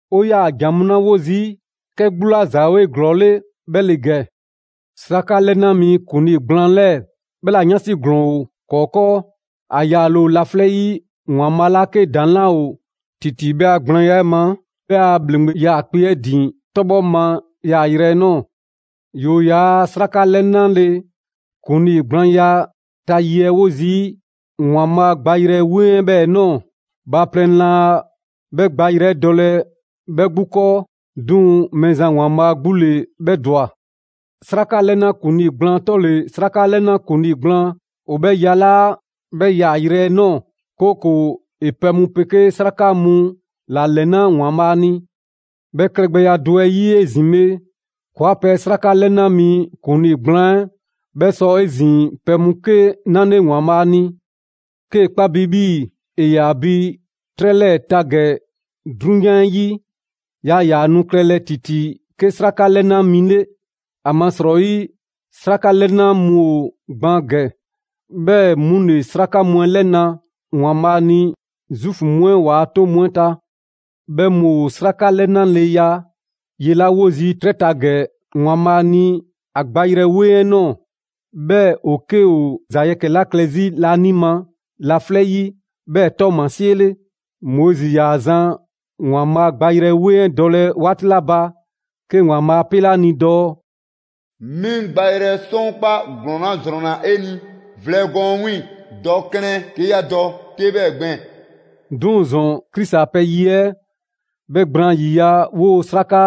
'O 'yaa‑ ‑jan mu 'la 'wo zii', 'kɛ 'gbu 'la ‑za ‑o 'eglɔɔle 'bhɛ ‑le ‑gɛ: 'Sraka 'lɛna mi ‑kuŋlii gblaan 'lɛɛ‑ 'bhɛ 'la 'yansi ‑glɔɔn ‑o ‑kɔɔ' 'kɔɔ. ‑A yaale ‑o laflɛ' 'yi ‑Waanbhaa' 'la 'ke ‑daŋ' 'laa ‑o ‑titi 'bhɛ a gblaanya 'ɛ ma, 'bhɛ a ‑bhleŋgbe 'yaakpe‑ 'ɛ ‑din 'tɔbhɔ ma yaayrɛ 'ɛ ꞊nɔɔ. ‑Yoo' ‑yaa' 'sraka 'lɛnale ‑kuŋlii gblaanya ta ye 'ɛ wo zii' ‑Waanbhaa' gbayrɛ 'weŋ 'ɛ 'bhɛɛ‑ ꞊nɔɔ; bhaaplɛŋ laa 'bhɛ gbayrɛ 'ɛ dɔlɛ 'bhɛ 'gbu 'kɔɔ, 'duŋ‑ Mɛɛzan ‑Waanbhaa' 'gbu ‑le 'bhɛ ‑dwa. 'Sraka 'lɛna ‑kuŋlii gblaan 'tɔle‑ 'sraka 'lɛna ‑kuŋlii gblaan ‑o 'bhɛ ‑yalaa' 'bhɛ yaayrɛ 'ɛ ꞊nɔɔ, 'kooko‑ ‑e pɛ mu 'pegee 'sraka mu ‑la ‑lɛna ‑Waanbhaa' ni. 'Bhɛ klɛgbɛya do 'ɛ 'yi 'ezin‑ bhe, ‑kɔɔa' pɛ 'sraka 'lɛna mi ‑kuŋlii gblaan 'ɛ, 'bhɛ sɔ 'ezin‑ pɛ mu 'ke 'nale ‑Waanbhaa' ni. 'Kee‑ 'kpa bi 'bhii‑ ‑e ‑yaa bi 'trɛ 'lɛɛ‑ ta ‑gɛ 'drunyan 'ɛ 'yi, yaa ‑yaa nu klɛlɛ ‑titi 'ke 'sraka 'lɛna mi 'le. ‑Amasrɔyi 'sraka 'lɛna mu ‑o gban ‑gɛ, 'bhɛɛ‑ 'mu ‑le 'sraka mu 'ɛ 'lɛna‑ ‑Waanbhaa' ni Zuufu mu 'ɛ ‑waa' 'toŋ mu 'ɛ ta. 'Bhɛ mu ‑o 'sraka 'lɛnaleya ye 'la 'wo zii' 'trɛ ta ‑gɛ ‑Waanbhaa' ni ‑a gbayrɛ 'weŋ 'ɛ ꞊nɔɔ, 'bhɛ ‑o 'ke ‑o ‑za yɛkɛ‑ 'la klɛ 'zi laanima laflɛ' 'yi 'bhɛɛ‑ ‑tɔɔmasie 'le. Moizi ‑yaa zan ‑Waanbhaa' gbayrɛ 'weŋ 'ɛ dɔlɛ 'waati 'la ba, 'ke ‑Waanbhaa' 'a 'pele ‑a ni dɔɔ: «'Mi 'ŋ gbayrɛ sɔkpaa' ‑glɔɔn 'la ‑zrɔnna 'e ni vlɛ gɔɔn 'ɛ 'wiiŋ‑, dɔ klɛn 'ke 'ya dɔ 'te 'bhɛɛ‑ gbɛɛn‑.» 'Duŋ‑ ‑zɔn, Krisi a pɛ ye 'ɛ 'bhɛ gblaan ‑yiya' 'woo‑ 'sraka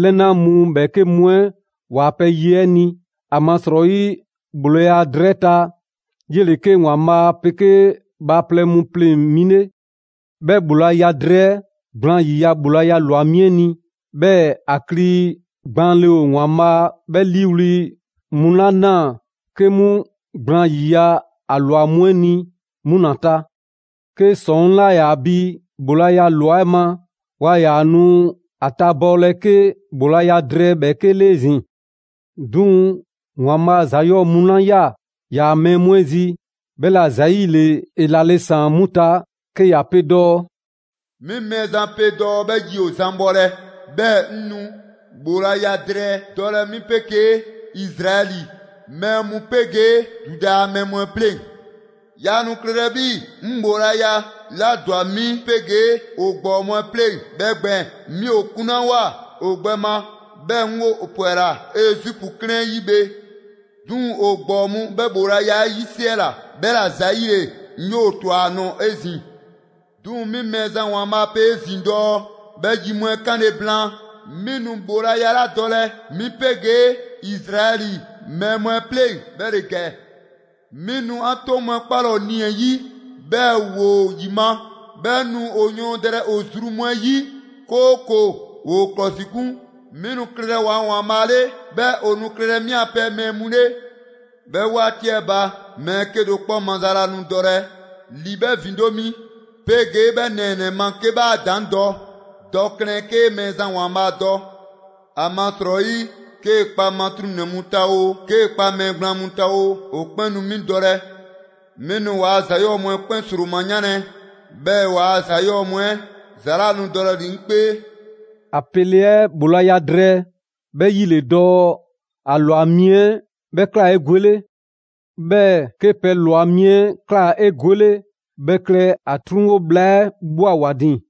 'lɛna mu ‑bhɛɛke' mu 'ɛ ‑waa' pɛ ye 'ɛ ni. ‑Amasrɔyi ‑bhoolaya drɛɛ 'ɛ ta, 'yele‑ 'ke ‑Waanbhaa' 'pegee bhaaplɛŋ mu pleŋ‑ mi 'le. 'Bhɛ ‑bhoolaya drɛɛ 'ɛ gblaan ‑yiya' ‑bhoolaya ‑lwa mi 'ɛ ni; 'bhɛɛ‑ ‑a kli gbaanle ‑o ‑Waanbhaa' 'bhɛ 'liiwli‑ mu 'la 'naa‑ 'ke 'mu gblaan ‑yiya' ‑a ꞊lwa mu 'ɛ ni, 'mu ‑la ta. 'Ke ‑sɔŋ' 'laa ‑yaa bi ‑bhoolaya ꞊lwa 'ɛ ma, waa ‑yaa nu ‑a tabɔɔlɛ 'ke ‑bhoolaya drɛɛ ‑bhɛɛke' 'le 'ezin‑. 'Duŋ‑ ‑Waanbhaa' ‑za 'yɔɔ‑ mu 'la ꞊ya ‑yaa' mɛɛ mu 'ɛ zi, 'bhɛla‑ ‑zayile ‑e ‑lale' ‑saan 'mu ta 'ke ‑ya pe dɔɔ: «'Mi Mɛɛzan pe dɔɔ 'bhɛ yi ‑o zan bhɔlɛ, 'bhɛɛ‑ 'ŋ nu ‑bhoolaya drɛɛ dɔlɛ 'mi 'pegee Izraɛli mɛɛ mu 'pegee Zuda a mɛɛ mu 'ɛ pleŋ‑. Yaa nu klɛlɛ 'bhii‑ 'ŋ ‑bhoolaya 'la ‑dwa 'mi 'pegee ‑o ‑gbɔɔ mu 'ɛ pleŋ‑ 'bhɛ gbɛɛn‑, 'mi ‑o 'kunlawoa ‑o gbɛ ma, 'bhɛɛ‑ 'ŋ ‑o 'pwɛla‑ Ezipu 'klɛɛn 'ɛ 'yi bhe. 'Duŋ‑ ‑o ‑gbɔɔ mu 'bhɛ ‑bhoolaya 'ɛ 'yisiɛla; 'bhɛla‑ ‑zayile 'mi ‑o ꞊twa ‑a nɔɔ‑ 'ezin‑. 'Duŋ‑ 'mi Mɛɛzan ‑Waanbhaa' pe 'ezin‑ dɔɔ 'bhɛ yi mu 'ɛ 'kanle‑ blaan, 'mi nu ‑bhoolaya 'la dɔlɛ 'mi 'pegee Izraɛli mɛɛ mu 'ɛ 'pleŋ‑ 'bhɛ ‑le ‑gɛ. 'Mi nu 'an 'toŋ mu 'ɛ 'kpalɛ‑ ‑o nii‑ 'ɛ 'yi, 'bhɛɛ‑ ‑woo ‑yima', 'bhɛɛ‑ 'ŋ nu ‑o yɔɔndɛlɛ ‑o zru mu 'ɛ 'yi, 'kooko‑ ‑woo ‑klɔsikun. 'Mi nu klɛlɛ ‑waa' ‑Waanbhaa' 'le, 'bhɛɛ‑ ‑o nu klɛlɛ 'mi 'an pɛ mɛɛ mu 'le. 'Bhɛ 'waati 'ɛ ba, mɛɛ 'kedo‑ 'kpɔ maza 'laa nu dɔlɛ ‑li 'bhɛ ‑vindo' mi, 'pegee 'bhɛ nɛɛnɛ‑ ma 'ke 'bhɛ 'a daan dɔɔ: Dɔ klɛn 'kee Mɛɛzan ‑Waanbhaa' dɔ. ‑Amasrɔyi 'kee‑ kpa matruŋnɛ mu ta oo, 'kee‑ kpa mɛɛ gblaan mu ta oo, ‑o 'kpɛn nu 'mi dɔlɛ. 'Mi nu ‑waa' ‑za 'yɔɔ‑ mu 'ɛ 'kpɛn ‑sroma 'yanlɛ‑, 'bhɛɛ‑ waa ‑za 'yɔɔ‑ mu 'ɛ ‑za 'laa nu dɔlɛ ‑li 'ŋ 'kpee.» ‑A pele 'ɛ ‑bhoolaya drɛɛ, 'bhɛ 'yi ‑le dɔɔ ‑a ‑lwa mi 'ɛ 'bhɛ ꞊kla 'egwele. 'Bhɛɛ‑ 'ke pɛ ꞊lwa mi 'ɛ ꞊kla 'egwele, 'bhɛ klɛ ‑a 'truŋwo bhla 'ɛ ꞊bhwa ‑wa ‑din.